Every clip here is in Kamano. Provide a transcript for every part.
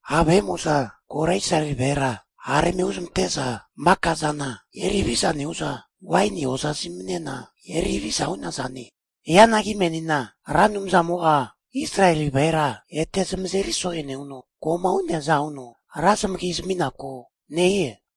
Ha' vahe'mo'za kora Israeli vahera hara eme huzamante'za maka zana eri haviza nehu'za waini hoza zaminena eri haviza hu'nazane. Hianagi menina Ra Anumzamo'a Israeli vahera ete zamazeri so'e nehuno, ko'ma hu'neaza huno ra zamagi zami'naku nehie.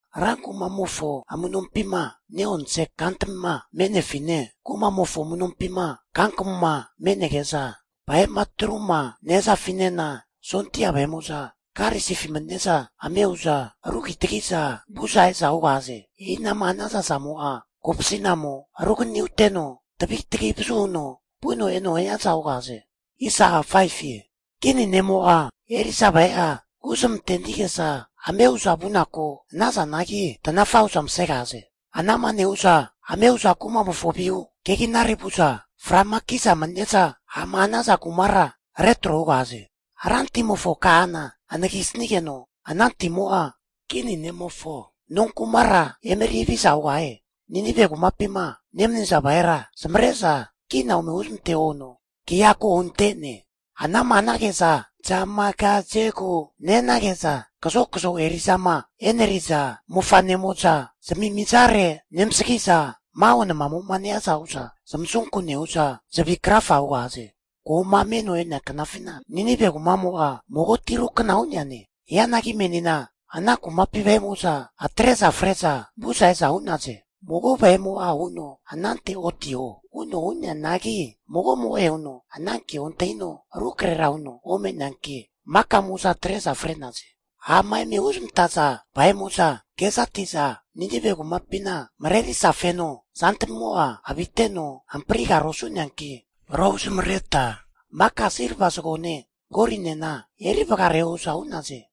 Rankumamofo amu'nompima ne'onse kantamima me'nefine, kumamofo amunompima kankamuma me'nege'za vahe'ma atruma nehazafinena, sondia vahe'mo'za karisifi mani'neza ame hu'za rugitagi'za vu'za e'za hugahaze. E'inama hanaza zamo'a kopasi'namo ruganani huteno, tavi tagi vazu huno vuno eno hiaza hugahaze. Kini ne'mo'a eri'za vahe'a huzamantenige'za ame hu'za vunaku hanazanagi, tanafa hu'za masegahaze. Ana'ma nehu'za ame hu'za kumamofo vihu keginare vu'za, fra'ma ki'za manine'za ha'ma hanaza kumara retro hugahaze. Rantimofo kahana ahenagisigeno, ana timo'a kini ne'mofo nonkumara emeri haviza hugahie. Ninive kumapima nemaniza vahera zamavare'za kina ome huzmanteho huno kea ko hunte'ne. Anama hanage'za zamagazegu nehanage'za kazokazo eri'zama e'neriza mofa'nemo'za zamimizare nemasagi'za, maho namamo'ma nehiaza hu'za zamasunku nehu'za zavi krafa hugahaze. Ko'ma meno e'nea knafina Ninive kumamo'a mago tirukna hu'neane. Hianagi menina ana kumapi vahe'mo'za atre'za freza vu'za e'za hu'naze. Ana nehazageno mago vahe'mo'a huno anante otiho! anante otiho! Huno hu'neanagi, magomo'e huno ana kea ontahino rukrahera huno ome'neanki maka'moza atre'za fre'naze. Ha'ma eme huzamantaza vahe'mo'za kezati'za, Ninive kumapina marerisa feno zantamimo'a aviteno hamprigara osu'neanki rohu zamareta maka silva zagone golinena eri vagareho hu'za hu'naze.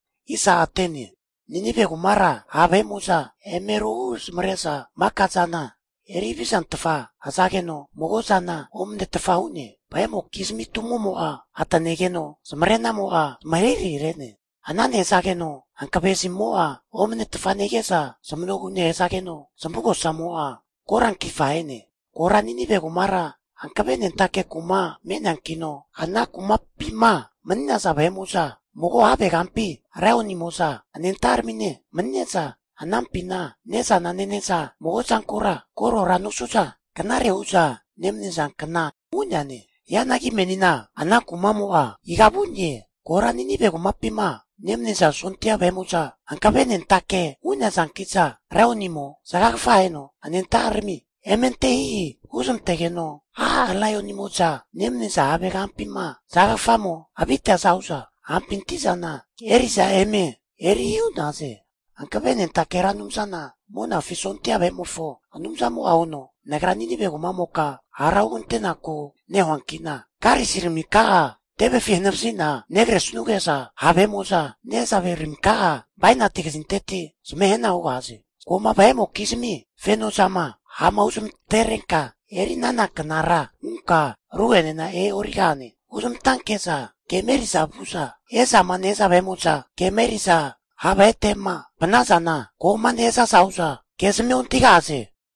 Ninive kumara ha' vahe'mo'za eme rohu zamare'za maka zana eri havizantfa hazageno, mago zana omanetfa hu'ne. Vahe'mokizmi tumo'mo'a atanegeno zamarenamo'a zamahirahi re'ne. Ana nehazageno hankave zamimo'a omanetfa nehige'za, zamanogu nehazageno zamavugosamo'a korankifa ahene. Kora Ninive kumara hankavenentake kuma me'neankino, ana kumapima mani'naza vahe'mo'za mago havegampi laionimo'za anenta'aramine manine'za, anampina ne'zana nene'za mago zankura korora nosu'za knare hu'za nemanizankna hu'neane. Hianagi menina ana kumamo'a iga vu'ne? Kora Ninive kumapima nemaniza sondia vahe'mo'za hankavenentake hu'nazanki'za, laionimo zagagafa aheno anenta'arami eme ante hihi huzmantegeno, a' laionimo'za nemaniza havegampima zagagafamo aviteaza hu'za, hapinti zana eri'za eme eri hihi hu'naze. Hankavenentake Ra Anumzana Monafi sondia vahe'mofo Anumzamo'a huno, Nagra Ninive kumamoka hara hugantenaku nehuankina karisiraminka'a tevefi hanavazi'na negresuge'za, ha' vahe'mo'za nehazaveraminka'a bainati kazinteti zamahe hana hugahaze. Ko'ma vahe'mokizmi feno zama ha'ma huzamagaterenka eri'nana knara hunka ru'enena e'origahane. Huzmantanke'za kema eri'za vu'za e'zama nehaza vahe'mo'zama, kema eri'za ha' vahete'ma vanazana, ko'ma nehazaza hu'za kezmia ontahigahaze.